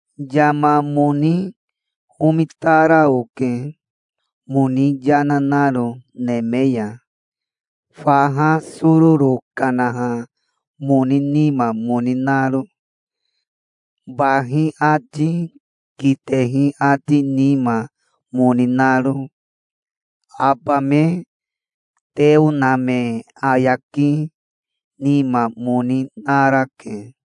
Yama moni omitara oke, moni yana naro neme ya, faha sororo kanaha moni nima moni naro, bahi ati kitehi ati nima moni naro. Aba me teo na me ayaki nima moni narake.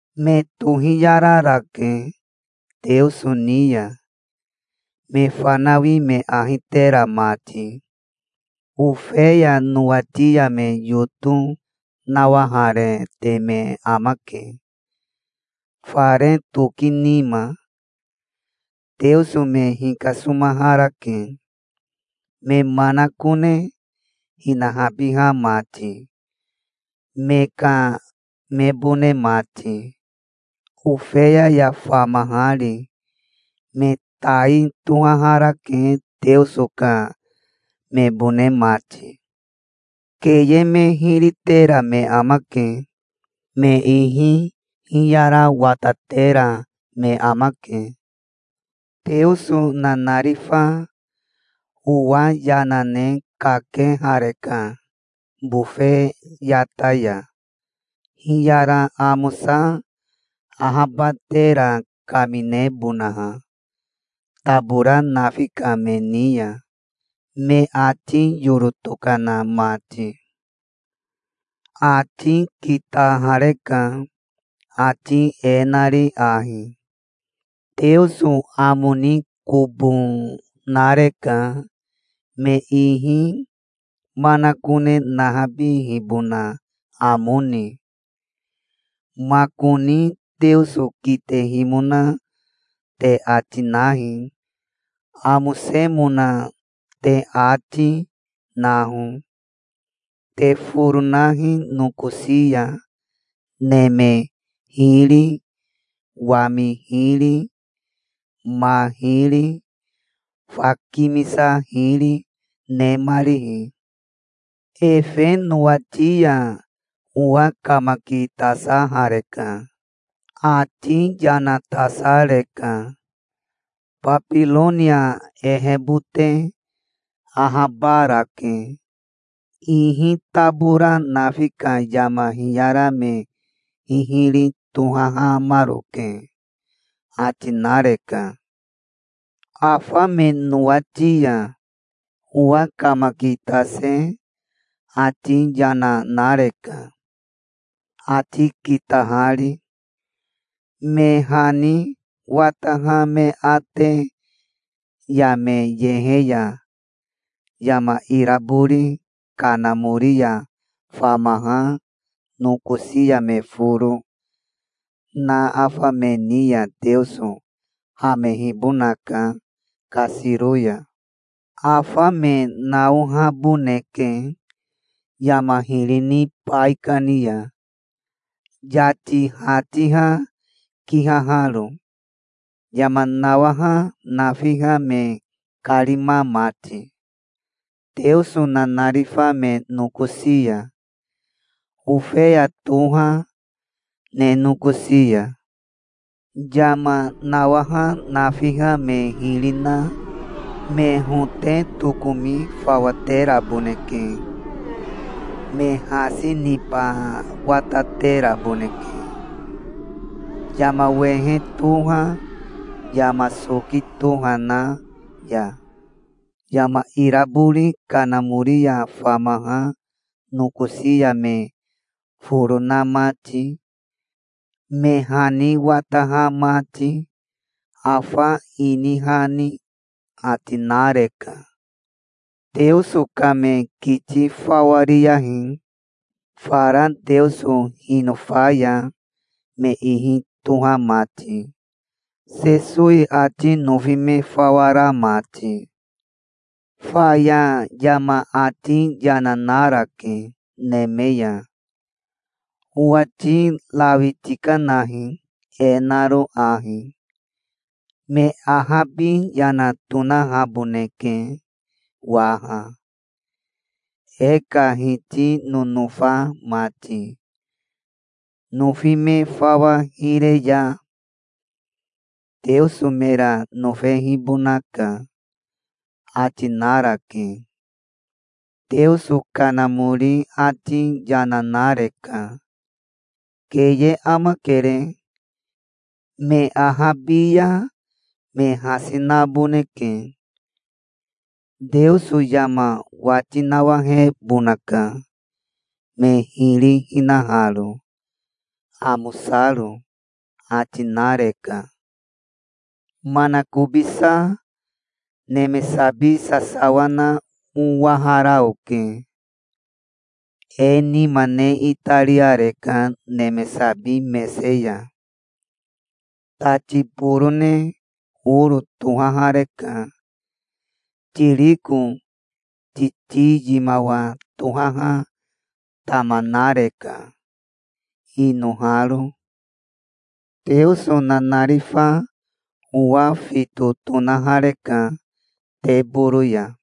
Me tohiyararake Teoso ni ya, me fanawi me ahi tera mati. Ofeya nowati ya me yoto nawaharete me amake, fare toki nima. Teoso me hikasomaharake, me manakone hinahabiha mati, me ka mebone mati, Ofeya ya famahari. Me tai tohaharake, Teoso ka mebone mati. Keye me hiri tera me amake. Me ihi hiyara watatera me amake. Teoso nanarifa owa yana ne kakehareka bofe yata ya, hiyara amosa ahabatera kaminebonaha tabora nafi ka me ni ya, me ati yoro tokana mati. Ati kitahareka, ati e nari ahi: "Teoso amo ni kobo nareka, me ihi manakone nahabihibona amo ni. Makoni Teoso kitehimona te ati nahi. Amosemona te ati, naho. Te foro nahi nokosi ya, neme hiri, wami hiri, ma hiri, fa kimisa hiri, nemarihi". Efe nowati ya owa kamakitasahareka. Ati yana tasareka. "Babironia ehebote ahabarake. Ihi tabora nafi ka yama hiyara me hihiri tohahamaroke", ati nareka. Afa me nowati ya owa kamakitase ati yana nareka, ati kitahari. "Me hani wataha me ate ya me yehe ya yama irabori kanamori ya famaha nokosi ya me foro na afa me ni ya Teoso hamehibonaka kasiro ya. Afa me naohaboneke yama hiri ni baikani ya, yati hatiha kihaharo, yama nawaha nafiha me karima mati, Teoso nanarifa me nokosi ya, Ofeya toha ne nokosi ya. Yama nawaha nafiha me hiri na me hote tokomi fawa teraboneke. Me hasi niba watateraboneke yama wehe toha yama soki toha na ya, yama irabori kanamori ya famaha nokosi ya me foro na mati, me hani wataha mati, afa ini hani", ati nareka. Teoso ka me kiti fawa riyahi, fara Teoso hinofa ya me ihi toha mati, Sesowi ati nofi me fawa ra mati. Faya yama ati yana narake neme ya. "Owati rawi tikanahi, e naro ahi: 'Me ahabi yana tonahaboneke waha, e ka Hiti nonofa mati. Nofi me fawa hire ya Teoso mera nofehibonaka'", ati narake. Teoso Kanamori ati yana nareka. "Keye amakere. Me ahabi ya me hasi naboneke. Teoso yama wati nawahebonaka, me hiri hinaharo, amosaro", ati nareka. Manakobisa neme sabi sasawa na owahara oke. E nima ne itariareka neme sabi mese ya. Tati borone oro tohahareka. Tiriko titi yimawa tohaha tama nareka, inoharo. Teoso nanarifa owa fito tonahareka teboro ya.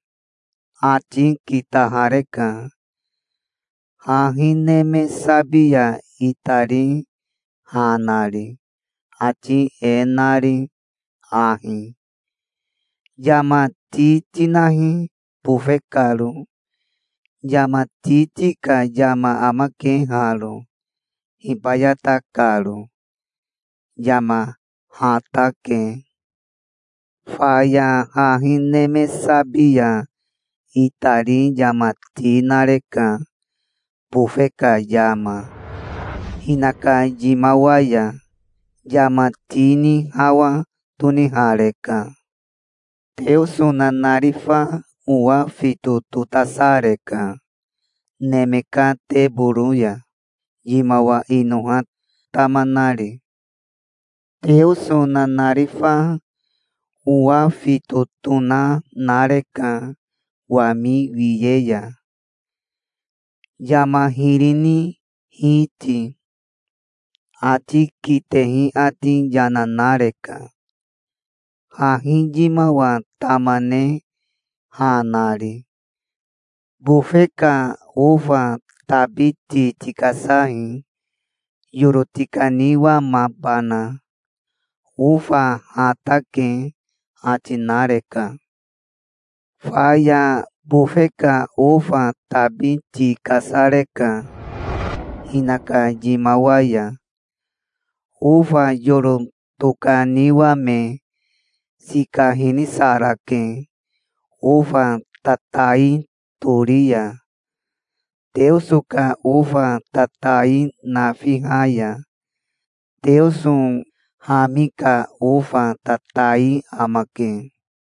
Ati kitahareka, hahi neme sabi ya itari ha nari, ati e nari ahi: "Yama ti tinahi bofe karo. Yama titi ka yama amake haro, hibayata karo. Yama hatake". Faya hahi neme sabi ya itari yama ti nareka bofe ka yama, hinaka yimawa ya. Yama ti ni hawa tonihareka. Teoso nanarifa owa fito totasareka neme ka teboro ya, yimawa inoha tama, nari. Teoso nanarifa owa fito tona nareka wami wiye ya, yama hiri ni hiti. Ati kitehi ati yana nareka, hahi yimawa tama ne ha nari. "Bofe ka ofa tabi ti tikasahi, yoro tikaniwamabana. Ofa hatake", ati nareka. Faya bofe ka ofa tabi ti kasareka hinaka yimawa ya. Ofa yoro tokaniwame sika hinisarake ofa tatai tori ya, Teoso ka ofa tatai nafiha ya. Teoso hami ka ofa tatai amake.